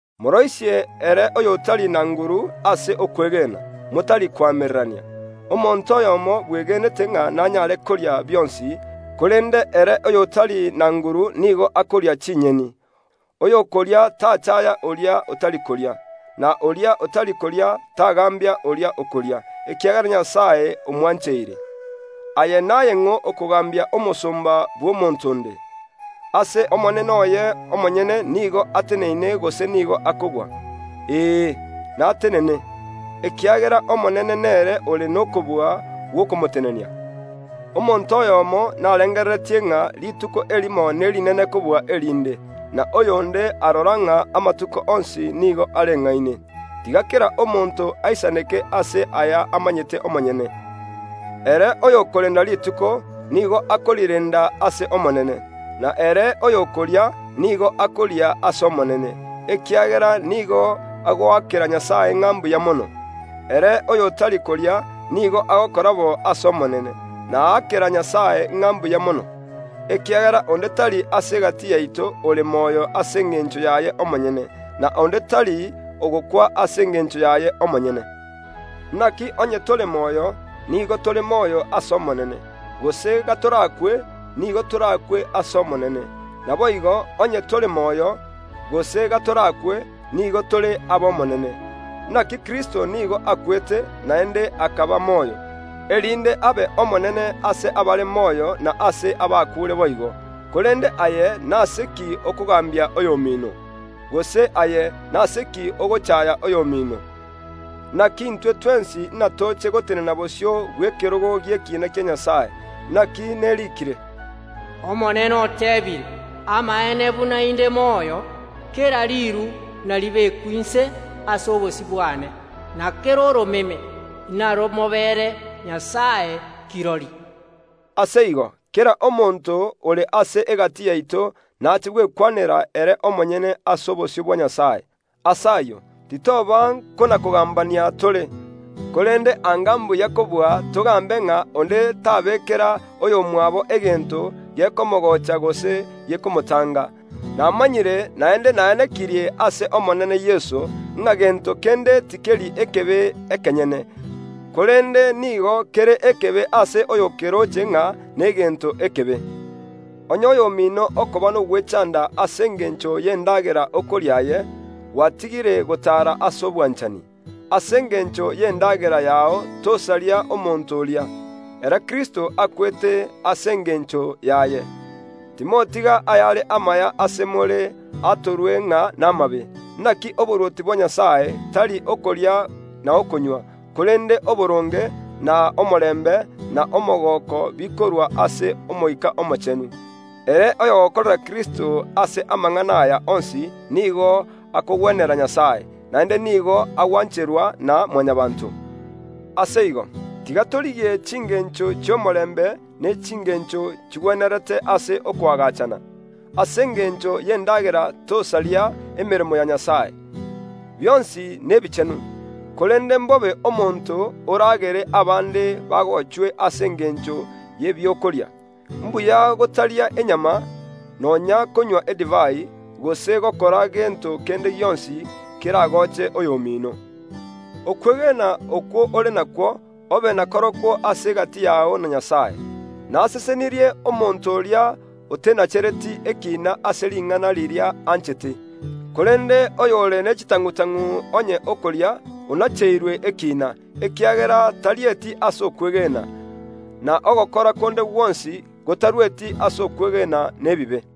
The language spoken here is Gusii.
Moroisie ere oy’otari na nguru ase okwegena, motari koamererania. Omonto oyomo bwegenete ng’a nanyare koria bionsi, korende ere oy’otari na nguru nigo akoria chinyeni. Oyokoria tachaaya oria otari koria, na oria otari koria tagaambia oria okoria, ekiagera Nyasae omwancheire. Aye naye ning’o okogaambia omosomba bw’omonto onde? Ase omonene oye omonyene nigo ateneine gose nigo akogwa. Ee, natenene, ekiagera Omonene nere ore n’okobua gw’okomotenenia. Omonto oyomo narengereretie ng’a rituko erimo nerinene kobua erinde, na oyonde arora ng’a amatuko onsi nigo areng’aine. Tiga kera omonto aisaneke ase aya amanyete omonyene. Ere oyokorenda rituko, nigo akorirenda ase Omonene, na ere oyokoria, nigo akoria ase Omonene, ekiagera nigo agoakera Nyasae ng’a mbuya mono; ere oy’otari koria, nigo agokora bo ase Omonene, na aakera Nyasae ng’a mbuya mono. Ekiagera onde tari ase egati yaito ore moyo ase engencho yaye omonyene; na onde tari ogokwa ase engencho yaye omonyene. Inaki onye tore moyo, nigo tore moyo ase Omonene; gose gatorakwe, nigo torakwe ase Omonene. Naboigo, onye tore moyo, gose gatorakwe, nigo tore aba Omonene. Inaki Kristo nigo akwete, naende akaba moyo, erinde abe Omonene ase abare moyo na ase abakuure boigo. Korende aye, nase ki okogaambia oy’omino? Gose aye, nase ki ogochaaya oy’omino? Inaki intwe twensi inatoche gotenena bosio bw’ekerogo gi’ekina kia Nyasae. Inaki neriikire, “Omonene oteebire: Amaene buna inde moyo, kera riiru inaribekwe inse ase obosio bwane, na kera oromeme ’naromobeere Nyasae kirori.” Ase igo, kera omonto ore ase egati yaito naache gwekwanera ere omonyene ase obosio bwa Nyasae. Ase ayio, titoba nkona‐kogaambania tore, korende anga mbuya kobua togaambe ng’a onde tabeekera oy’omwabo egento gekomogocha gose gekomotanga. Namanyire, naende naenekirie ase Omonene Yeso, ng’a gento kende tikeri ekebe ekenyene, korende nigo kere ekebe ase oyo okeroche ng’a negento ekebe. Onye oy’omino okoba n’ogwechanda ase engencho y’endagera okoria aye, gwatigire gotaara ase obwanchani. Ase engencho y’endagera yao tomobeyia omonto oria, ere Kristo akwete ase engencho yaye. Timotiga ayare amaya ase more atorwe ng’a n’amabe. Inaki oborwoti bwa Nyasae tari okoria na okonywa, korende oboronge, na omorembe, na omogooko bikorwa ase Omoika Omochenu. Ere oy’ogokorera Kristo ase amang’ana aya onsi nigo akogwenera Nyasae, naende nigo agwancherwa na Mwanyabaanto. Ase igo, tiga torigie chingencho chi’omorembe ne chingencho chigwenerete ase okoagachana. Ase engencho y’endagera tosaria emeremo ya Nyasae. Bionsi nebichenu; korende ’mbobe omonto oragere abande bagochwe ase engencho y’ebiakoria. Mbuya gotaria enyama, nonya ’nkonywa edivai, gose gokora gento kende gionsi keragoche oy’omino. Okwegena okwo ore nakwo, obe nakorokwo ase egati yao na Nyasae. Nasesenirie omonto oria otenachereti ekiina ase ring’ana riria anchete. Korende oyore ne chitang’u‐tang’u onye okoria, onacheirwe ekiina, ekiagera tarieti ase okwegena; na ogokora konde gwonsi gotarueti ase okwegena nebibe.